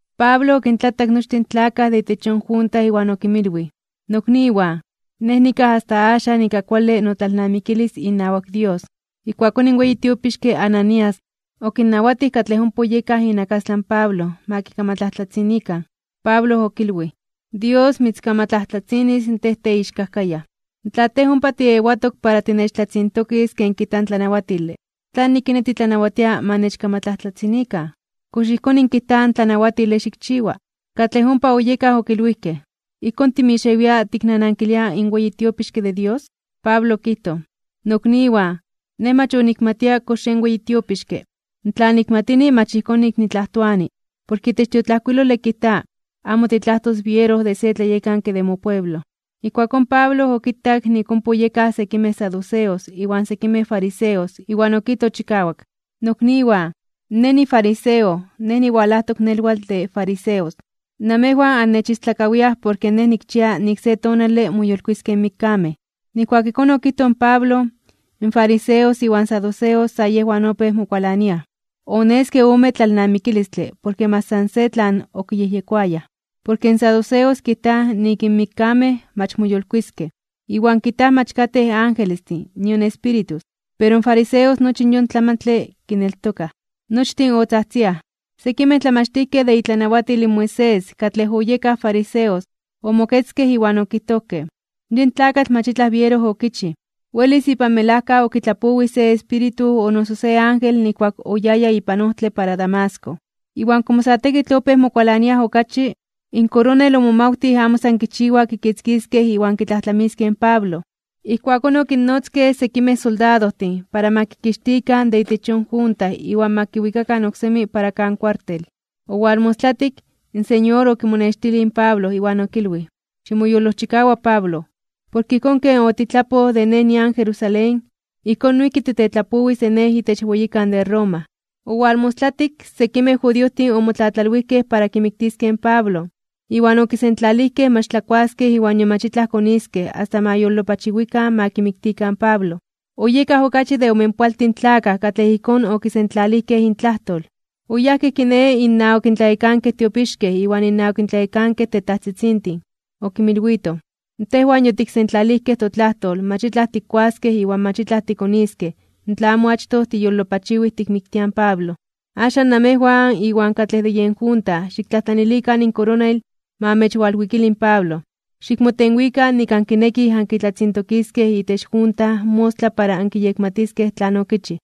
Pablo okintlatak nochtin in tlakaj de itech yon junta iwan okinmilwij: ―Nokniwan, nej nikaj asta axan ika kuale notlalnamikilis inawak Dios. Ijkuakón in weyi tiopixke Ananías, okinnawatij katlej ompa oyekaj inakastlan Pablo, ma kikamatlajtlatzinikan. Pablo okilwij: ―¡Dios mitzkamatlajtlatzinis tej teixkajkayaj! Tla tej ompa tiewatok para tinechtlatzintokis ken kijta in tlanawatile, ¿tlanik kiné titlanawatia ma nechkamatlajtlatzinikan? ¿Kox ijkón kijta in tlanawatile xikchiwa? Katlej ompa oyekaj okilwijkej: ―¿Ijkón timixewia tiknanankilia in weyi tiopixke de Dios? Pablo okijtoj: ―Nokniwan, nej mach onikmatia kox yen weyi tiopixke. Tla nikmatini mach ijkón nik nitlajtoani, porke itech in tiotlajkuilole kijta: “Amo titlajtos biero de se tlayekanke de mopueblo.” Ijkuakón Pablo okitak nik ompa oyekaj sekimej saduceos iwan sekimej fariseos, iwan okijtoj chikawak: ―Nokniwan, nej nifariseo, nej niwalajtok nelwatl de fariseos. Namejwan annechistlakawiaj porke nej nikchia nik se tonale moyolkuiskej (moyolitiskej) in mikkamej. Nijkuak ijkón okijtoj in Pablo, in fariseos iwan saduceos sa yejwan opéj mokualaniaj. Oneske ome tlalnamikilistle porke mach san se tlan okiyejyekoayaj. Porke in saduceos kijtaj nik in mikkamej mach moyolkuiskej, iwan kijtaj mach katej angelestin nion espíritus, pero in fariseos nochi yon tlamantle kineltokaj. Nochtin otzajtziaj. Sekimej tlamachtijkej de itlanawatil in Moisés, katlej oyekaj fariseos, omoketzkej iwan okijtojkej: ―Yin tlakatl mach itlaj biero okichij. Welis ipan melajka okitlapowij se espíritu o noso se ángel nijkuak oyaya ipan ojtle para Damasco. Iwan komo sa tekitl opéj mokualaniaj okachi, in koronel omomawtij amo san kichiwa kitzkiskej iwan kitlajtlamiskej in Pablo. Ijkuakón okinnotzkej sekimej soldadojtin para ma kixtikan de itech yon junta iwan ma kiwikakan oksemi para kan kuartel. Owalmostlayuaktik, in Señor okimonextilij in Pablo iwan okilwij: ―Ximoyolojchikawa, Pablo, porke ijkón ken otitlapoj de Nej nian Jerusalén, ijkón noijki titetlapowis de Nej itech weyikan de Roma. Owalmostlatik, sekimej judiojtin omotlatlalwijkej para kimiktiskej in Pablo, iwan okisentlalijkej mach tlakuaskej iwan nion mach itlaj koniskej asta ma yolopachiwikan ma kimiktikan in Pablo. Oyekaj okachi de omenpoaltin tlakaj katlej ijkón okisentlalijkej intlajtol. Oyajkej kiné innawak in tlayekankej tiopixkej iwan innawak in tlayekankej tetajtzitzintin. Okinmilwitoj: ―Tejwan yotiksentlalijkej totlajtol mach itlaj tikkuaskej iwan mach itlaj tikoniskej tla amo achtoj tiyolopachiwij tikmiktiaj in Pablo. Axan namejwan iwan katlej de yen junta xiktlajtlanilikan in koronel ma amechwalwikili in Pablo, xikmotenwikan nik ankinekij ankitlatzintokiskej itech junta mostla para ankiyekmatiskej tlan okichij.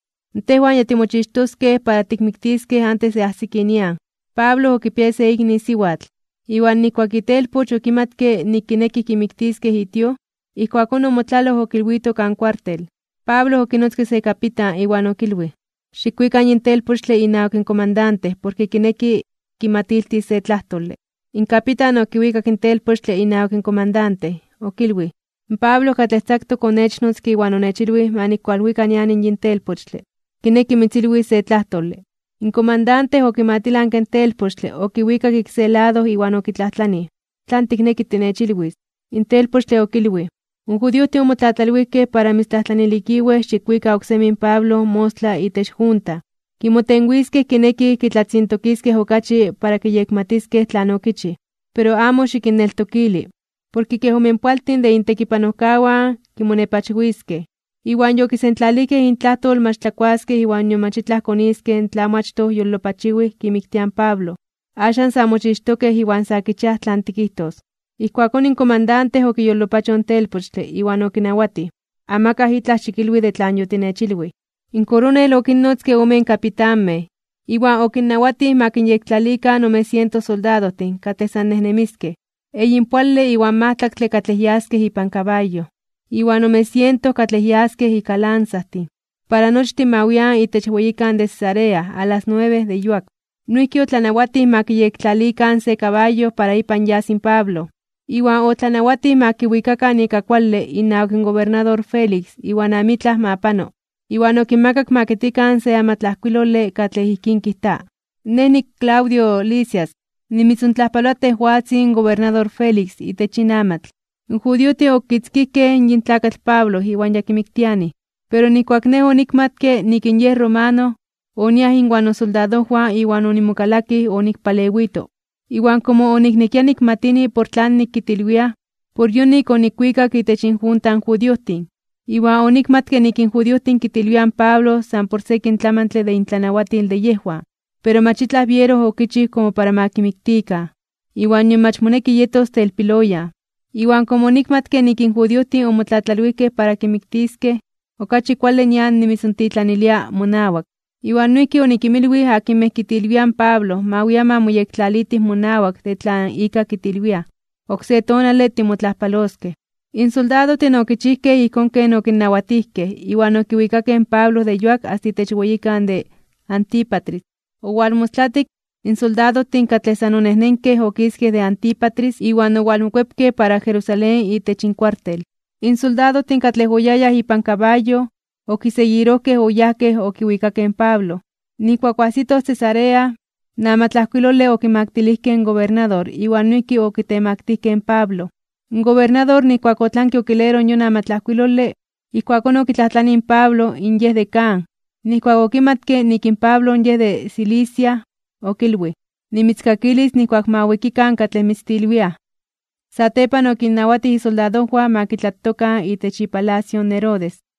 Tejwan ya timochixtoskej para tikmiktiskej antes de ajsiki nian. Pablo okipiaya se ikni siwatl. Iwan nijkuak itelpoch okimatke nik kinekij kimiktiskej itio, ijkuakón omotlaloj okilwito kan kuartel. Pablo okinotzke se kapitan, iwan okilwij: ―Xikwika yin telpochtle inawak in komandante porke kineki kimatiltis se tlajtole. In kapitan okiwikak in telpochtle inawak in komandante. Okilwij: ―Pablo katlej tzaktok onechnotzke iwan onechilwij ma nikwalwika nian yin telpochtle. Kineki mitzilwis se tlajtole. In komandante okimatilanke in telpochtle okiwikak ik se lado iwan okitlajtlanij: ―¿Tlan tikneki tinechilwis? In telpochtle okilwij: ―In judiojtin omotlatlalwijkej para mitztlajtlanilikiwej xikwika oksemi in Pablo mostla itech junta, kimotenwiskej kinekij kitlatzintokiskej okachi para kiyekmatiskej tlan okichij. Pero amo xikinneltokili, porke kej omenpoaltin de intekipanojkawan kimonepachwiskej, iwan yokisentlalijkej intlajtol mach tlakuaskej iwan nion mach itlaj koniskej tla amo achtoj yolopachiwij kimiktiaj in Pablo. Axan ya mochixtokej iwan sa kichiaj tlan tikijtos. Ijkuakón in komandante okiyolopachoj in telpochtle. Iwan okinawatij amakaj itlaj ma kilwi de tlan yokilwij. In koronel okinnotzke omen kapitanmej, iwan okinnawatij ma kinyektlalikan ome siento soldadojtin katlej san nejnemiskej, eyinpoale iwan majtlaktle katlej yaskej ipan kabayo, iwan ome siento katlej yaskej ika lanzajtin. Para nochtin ma wian itech weyikan de Cesarea a las nuebe de yuak. Noijki otlanawatij ma kiyektlalikan se kabayo para ipan yas in Pablo, iwan otlanawatij ma kiwikakan ika kuale inawak in gobernador Félix iwan amitlaj ma pano. Iwan okinmakak ma kitkikan se amatlajkuilole katlej ijkín kijta: “Nej niClaudio Lisias. Nimitzontlajpaloa tejwatzin gobernador Félix itech yin amatl. In judiojtin okitzkijkej yin tlakatl Pablo iwan yakimiktianij, pero nijkuak nej onikmatke nik in yej romano, oniaj inwan nosoldadojwan iwan onimokalakij onikpalewito. Iwan komo oniknekia nikmatini por tlanik kitilwiaj, por yonik onikwikak itech injunta in judiojtin. Iwan onikmatke nik in judiojtin kitilwiaj in Pablo san por sekin tlamantle de intlanawatil de yejwan. Pero mach itlaj biero okichij komo para ma kimiktikan, iwan nion mach moneki yetos telpiloyan. Iwan komo onikmatke nik in judiojtin omotlatlalwijkej para kimiktiskej, okachi kuale nian nimitzontitlanilia monawak. Iwan noijki onikinmilwij akinmej kitilwiaj in Pablo ma wian ma moyektlalitij monawak de tlan ika kitilwiaj. Oksé tonale timotlajpaloskej.” In soldadojtin okichijkej ijkón ken okinnawatijkej, iwan okiwikakej in Pablo de yuak asta itech weyikan de Antípatris. Owalmostlatik, in soldadojtin katlej san onejnenkej okiskej de Antípatris iwan owalmokuepkej para Jerusalén itech inkuartel. In soldadojtin katlej oyayaj ipan kabayo, okiseguirojkej oyajkej okiwikakej in Pablo. Nijkuak oajsitoj Cesarea, in amatlajkuilole okimaktilijkej in gobernador iwan noijki okitemaktijkej (okitemaktilijkej) in Pablo. In gobernador nijkuak otlanke okileroj yon amatlajkuilole, ijkuakón okitlajtlanij in Pablo in yej de kan. Nijkuak okimatke nik in Pablo yej de Cilicia, okilwij: ―Nimitzkakilis nijkuak ma wikikan katlej mitztilwiaj. Satepan okinnawatij isoldadojwan ma kitlatokan itech ipalacio in Herodes.